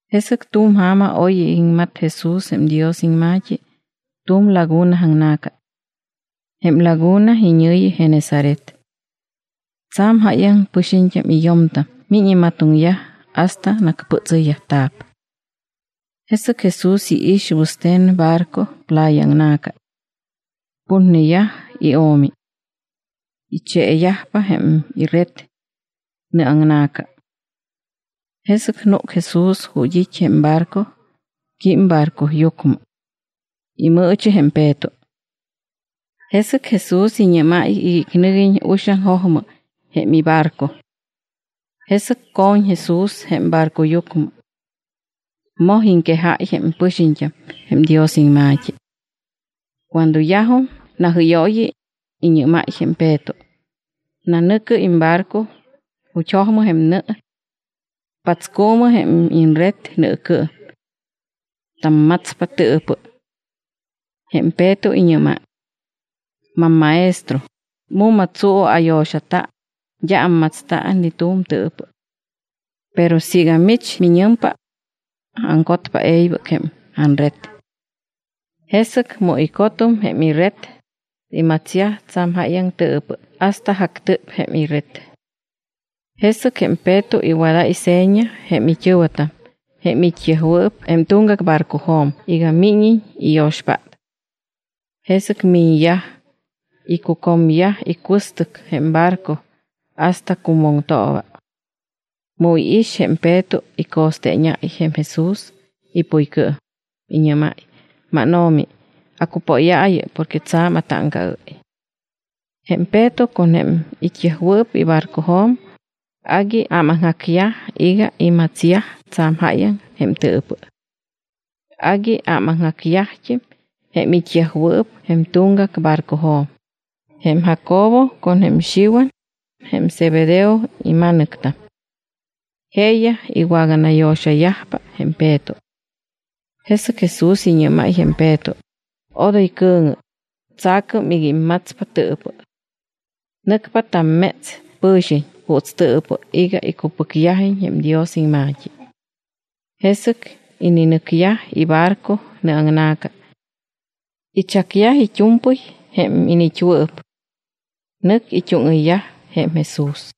Jesɨc tu̱m ja̱ma oy iŋmat Jesús jém Dios iŋma̱t́i tu̱m laguna aŋna̱ca. Jém laguna iñɨ̱yi Genesaret. Tsa̱m jáyaŋ pɨxiñt́am y yo̱mtam miñ imatoŋyaj hasta nacpɨtsɨyyajta̱p. Jesɨc Jesús iix wɨste̱n barco playa aŋna̱ca. Putneyaj io̱mi. Icheeyajpa jém ired nɨaŋna̱ca. Jesɨc núc Jesús ju̱t́ it́ jém barco, quím barcoyucmɨ. Imɨɨchi jém Peto. Jesɨc Jesús iñɨ́máy iga icnɨguiñ uxaŋ jojmɨ jém ibarco. Jesɨc co̱ñ Jesús jém barcoyucmɨ. Moj iŋquejáy jém pɨxiñt́am jém Dios iŋma̱t́i. Cuando yajum najɨ́yooyi, iñɨ́máy jém Peto: —Nanɨ̱cɨ imbarco ju̱t́ jojmɨ jém nɨ. Patscuumɨ jém iñred nɨɨcɨɨm. Tammatspa tɨɨpɨ. Jém Peto iñɨ́máy: —MamMaestro, mu̱ma tsuu ayo̱xata, d́a ammatsta ni tu̱m tɨɨpɨ. Pero siiga mich miñɨmpa, aŋcotpa e̱ybɨc jém anred. Jesɨc mu icotum jém ired, imatsyaj tsa̱m jáyaŋ tɨɨpɨ hasta jactɨp jém ired. Jesɨc jém Peto iwadáy seña jém it́ɨ̱wɨtam jém it́yajwɨɨp jém tuŋgac barcojo̱m iga míñiñ iyo̱xpát. Jesɨc miñyaj, icucomyaj icuɨstɨc jém barco hasta cumoŋtooba. Mu iix, jém Peto ico̱steeñáy jém Jesús ipuycɨɨm, iñɨ́máy: —MánO̱mi, acupóyaayɨ porque tsa̱m atáŋcaɨ́y. Jém Peto con jém it́yajwɨɨp ibarcojo̱m agui ámaŋjacyaj iga imatsyaj tsa̱m jáyaŋ jém tɨɨpɨ. Agui ámaŋjacyajt́im jém it́yajwɨɨp jém tuŋgac barcojo̱m, jém Jacobo con jém Xiwan, jém Zebedeo ima̱nɨctam. Jeeyaj iwaganayo̱xayajpa jém Peto. Jesɨc Jesús iñɨ́máy jém Peto: —Odoy cɨ̱ŋɨ, tsa̱cɨm iga immatspa tɨɨpɨ. Nɨcpa tamméts pɨ̱xiñ juuts tɨɨpɨ iga icupɨcyajiñ jém Dios iŋma̱t́i. Jesɨc ininɨcyaj ibarco nɨaŋna̱ca. Ichacyaj it́u̱mpɨy jém iniit́wɨɨp. Nɨc it́úŋɨyyaj jém Jesús.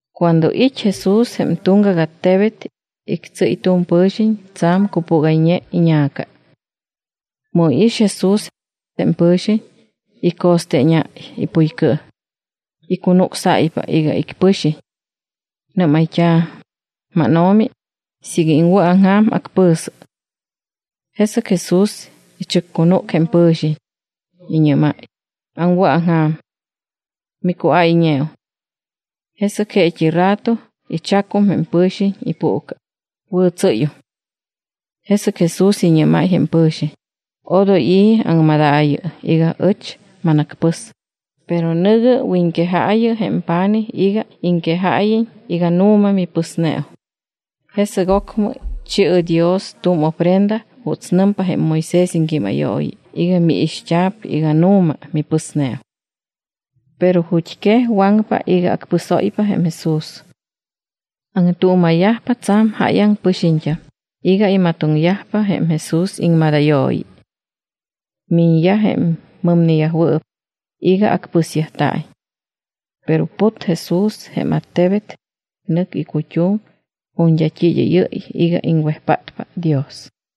Cuando it́ Jesús jém tuŋgac attebet, ictsɨ́y tu̱m pɨ̱xiñ tsa̱m cupúgayñe iña̱ca. Mu iix Jesús, jém pɨ̱xiñ ico̱steeñáy ipuycɨɨm. Icunucsáypa iga icpɨxiñ. Nɨ́mayt́a̱: —MánO̱mi, siiga iŋwɨ̱aŋja̱m, acpɨ̱sɨ. Jesɨc Jesús ichɨccunúc jém pɨ̱xiñ, iñɨ́máy: —Aŋwɨ̱aŋja̱m. Micuáyñeum. Jesɨc jeet́i rato ichacum jém pɨ̱xiñ ipuuca, wɨ̱tsɨ́yum. Jesɨc Jesús iñɨ́máy jém pɨ̱xiñ: —Odoy i̱ aŋmadaayɨ iga ɨch manacpɨs, pero nɨ̱gɨ wiñquejaayɨ jém pa̱nij iga iŋquejáyiñ iga nu̱ma mipɨsneum. Jesɨc ocmɨ chi̱ɨ Dios tu̱m ofrenda juuts nɨmpa jém Moisés iŋquímayooyi iga miixt́a̱p iga nu̱ma mipɨsneum. Pero ju̱t́quej waŋpa iga acpɨsóypa jém Jesús. Aŋtuuma̱yajpa tsa̱m jáyaŋ pɨxiñt́am iga imatoŋyajpa jém Jesús iŋmadayooyi. Miñyaj jém mɨmneyajwɨɨp iga acpɨsyajta̱iñ. Pero put Jesús jém attebet, nɨc icut́um ju̱t́ d́a t́i id́ɨ́yɨ́y iga iŋwejpátpa Dios.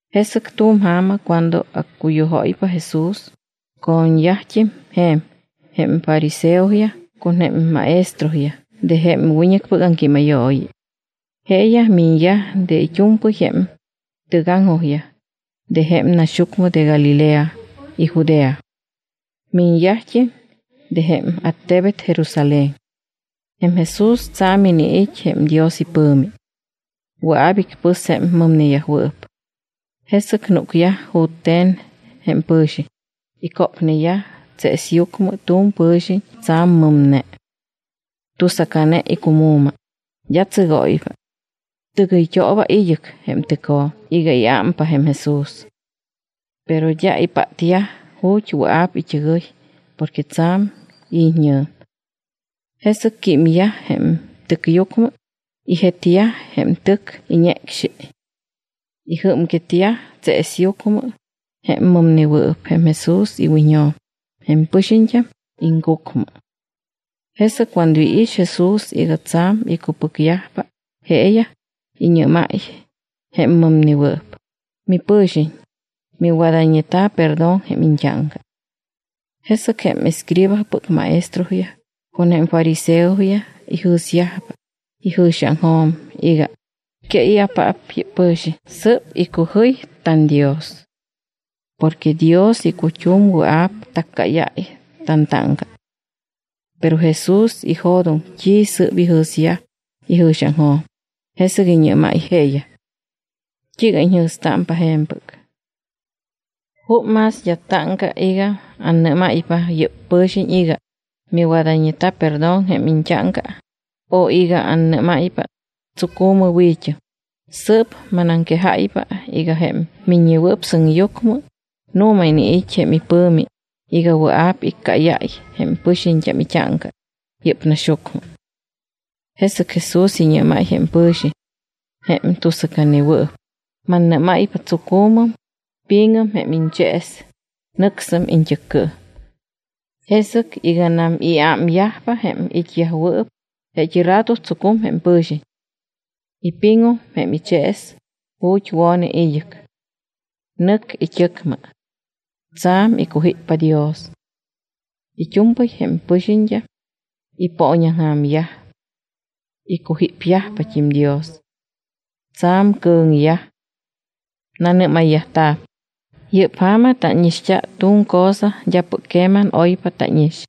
Jesɨc tu̱m ja̱ma cuando accuyujóypa Jesús, co̱ñyajt́im je̱m jém fariseoyaj con jém maestroyaj de jém wiñɨcpɨc aŋquímayooyi. Jeeyaj miñyaj de it́u̱mpɨy jém tɨgaŋjojyaj de jém naxyucmɨ de Galilea y Judea. Miñyajt́im de jém attebet Jerusalén. Jém Jesús tsa̱m iniit́ jém Dios ipɨ̱mi. Wɨa̱p icpɨs jém mɨmneyajwɨɨp. Jesɨc núcyaj jute̱n jém pɨ̱xiñ, icópneyaj tseesyucmɨ tu̱m pɨ̱xiñ tsa̱m mɨmne. Tusacane icumu̱ma, d́a tsɨgóypa. Tɨgɨyt́ooba id́ɨc jém tɨcjo̱m iga iámpa jém Jesús. Pero d́a ipátyaj ju̱t́ wɨa̱p it́ɨgɨy porque tsa̱m it́ñɨ̱m. Jesɨc químyaj jém tɨcyucmɨ, ijetyaj jém tɨc iñecxi. Ijɨ́mquetyaj tseesyucmɨ jém mɨmnewɨɨp jém Jesús iwiñjo̱m jém pɨxiñt́am aŋcucmɨ. Jesɨc cuando iix Jesús iga tsa̱m icupɨcyajpa jeeyaj, iñɨ́máy jém mɨmnewɨɨp: —Mipɨ̱xiñ, miwadayñeta̱ perdón jém iñt́áŋca. Jesɨc jém escribaspɨc maestroyaj con jém fariseoyaj ijɨ̱syajpa ijɨ̱xiaŋjo̱m iga: “¿Que i̱apaap yɨ́p pɨ̱xiñ? Sɨ́p icujɨy tanDios. Porque Dios icut́um wɨa̱p taccáyáy tantáŋca.” Pero Jesús ijo̱doŋ t́i sɨ́p ijɨ̱syaj ijɨ̱xiaŋjo̱m, jesɨc iñɨ́máy jeeyaj: —¿T́iiga iñjɨ̱stámpa je̱mpɨc? ¿Jup más d́a táŋca iga annɨ́máypa yɨ́p pɨ̱xiñ iga: “Miwadayñeta̱ perdón jém iñt́áŋca”, o iga annɨ́máypa: “Tsucu̱mɨ, wi̱t́ɨm”? Sɨɨp manaŋquejáypa iga jém Miññewɨɨp Sɨŋyucmɨ nu̱ma iniit́ jém pɨ̱mi iga wɨa̱p iccáyáy jém pɨxiñt́am it́áŋca yɨ́p naxyucmɨ. Jesɨc Jesús iñɨ́máy jém pɨ̱xiñ jém tusacanewɨɨp: —Mannɨ́máypa, tsucu̱mɨm, pi̱ŋɨm jém iñchees, nɨcsɨm iñt́ɨccɨɨm. Jesɨc iganam iámyajpa jém it́yajwɨɨp, jeet́i rato tsucum jém pɨ̱xiñ. Ipiŋum jém ichees ju̱t́ wo̱ne id́ɨc. Nɨc it́ɨcmɨ. Tsa̱m icujíppa Dios. It́u̱mpɨy jém pɨxiñt́am ipooñaŋja̱myaj. Icujípyajpat́im Dios. Tsa̱m cɨ̱ŋyaj. Nanɨ́mayyajta̱p: —Yɨ́p ja̱ma tánixt́a tu̱m cosa d́apɨc queman oypa tánix.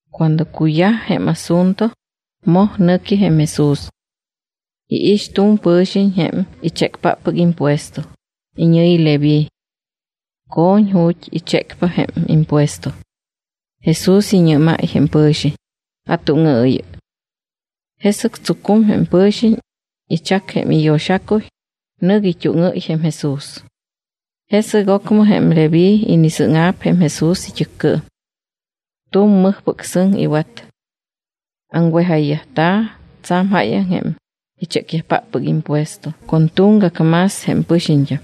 Cuando cuyaj jém asunto, moj nɨqui jém Jesús. Iix tu̱m pɨ̱xiñ jém ichécpáppɨc impuesto, iñɨ̱yi Leví. Co̱ñ ju̱t́ ichécpa jém impuesto. Jesús iñɨ́máy jém pɨ̱xiñ: —Atúŋɨɨyɨ. Jesɨc tsucum jém pɨ̱xiñ, ichac jém iyo̱xacuy, nɨc it́úŋɨ́y jém Jesús. Jesɨc ocmɨ jém Leví inisɨ́ŋa̱p jém Jesús it́ɨccɨɨm. Tu̱m mɨjpɨc sɨŋ iwat. Aŋwejayyajta̱ tsa̱m jáyaŋ jém ichécyajpáppɨc impuesto con tuŋgac más jém pɨxiñt́am.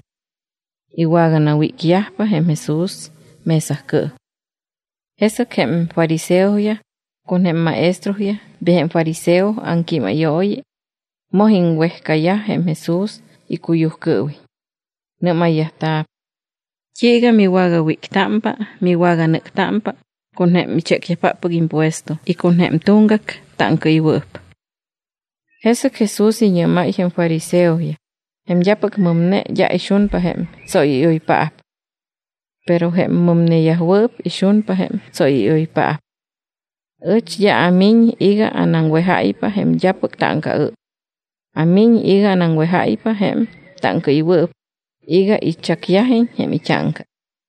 Iwaganawícyajpa jém Jesús mesacɨɨm. Jesɨc jém fariseoyaj con jém maestroyaj de jém fariseo iŋquímayooyi moj iŋwejcayaj jém Jesús icuyujcɨɨwiñ. Nɨ́mayyajta̱p: —¿T́iiga miwagawíctámpa y miwaganɨ́ctámpa con jém ichécyajpáppɨc impuesto y con jém tuŋgac táŋcaɨywɨɨp? Jesɨc Jesús iñɨ́máy jém fariseoyaj: —Jém d́apɨc mɨmne d́a ixunpa jém tsóyɨ́yoypaap. Pero jém mɨmneyajwɨɨp ixunpa jém tsóyɨ́yoypaap. Ɨch d́a amiñ iga anaŋwejáypa jém d́apɨc táŋcaɨ́y. Amiñ iga anaŋwejáypa jém táŋcaɨywɨɨp iga ichacyajiñ jém it́áŋca.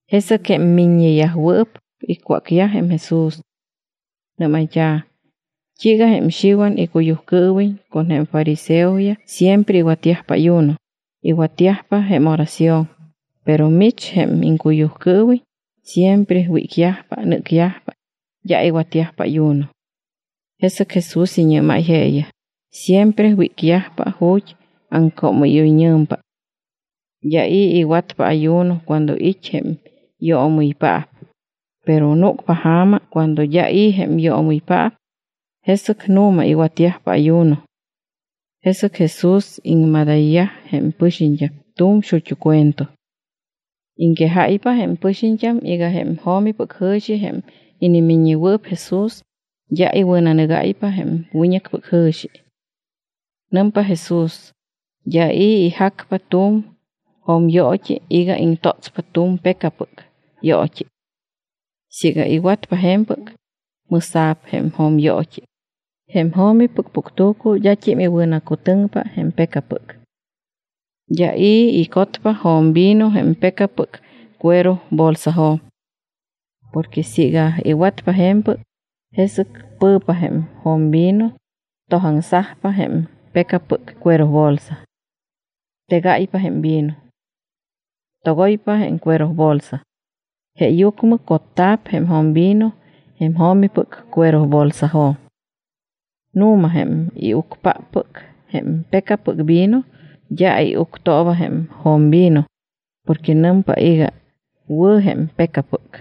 Jesɨc jém miññeyajwɨɨp icwácyaj jém Jesús. Nɨ́mayt́a̱: —¿T́iiga jém Xiwan icuyujcɨɨwiñ con jém fariseoyaj siempre iwatyajpa ayuno, iwatyajpa jém oración? Pero mich jém iŋcuyujcɨɨwiñ siempre wícyajpa, nɨ́cyajpa, d́a iwatyajpa ayuno. Jesɨc Jesús iñɨ́máy jeeyaj: —Siempre wícyajpa ju̱t́ aŋcoomɨ́yoyñɨ̱mpa. D́a i̱ iwatpa ayuno cuando it́ jém yoomɨypaap. Pero núcpa ja̱ma cuando d́a i̱ jém yoomɨypaap. Jesɨc nu̱ma iwatyajpa ayuno. Jesɨc Jesús iŋmadayyaj jém pɨxiñt́am tu̱m xut́u cuento. Iŋquejáypa jém pɨxiñt́am iga jém jo̱mipɨc jɨ̱xi jém inimiññewɨɨp Jesús d́a iwɨ̱nanɨgáypa jém wiñɨcpɨc jɨ̱xi. Nɨmpa Jesús: —D́a i̱ ijacpa tu̱m jo̱myoot́i iga iŋtótspa tu̱m pecapɨc yoot́i. Siiga iwatpa je̱mpɨc, mɨ̱sa̱p jém jo̱myoot́i. Jém jo̱mipɨc puctu̱cu d́at́im iwɨ̱nacutɨŋpa jém pecapɨc. D́a i̱ icotpa jo̱mvino jém pecapɨc cuerobolsajo̱m. Porque siiga iwatpa je̱mpɨc, jesɨc pɨ̱pa jém jo̱mvino, tojaŋsajpa jém pecapɨc cuerobolsa. Tegáypa jém vino. Togoypa jém cuerobolsa. Jeeyucmɨ cotta̱p jém jo̱mvino jém jo̱mipɨc cuerobolsajo̱m. Nu̱ma, jém iucpáppɨc jém pecapɨc vino d́a iuctooba jém jo̱mvino porque nɨmpa iga: “Wɨ̱ jém pecapɨc.”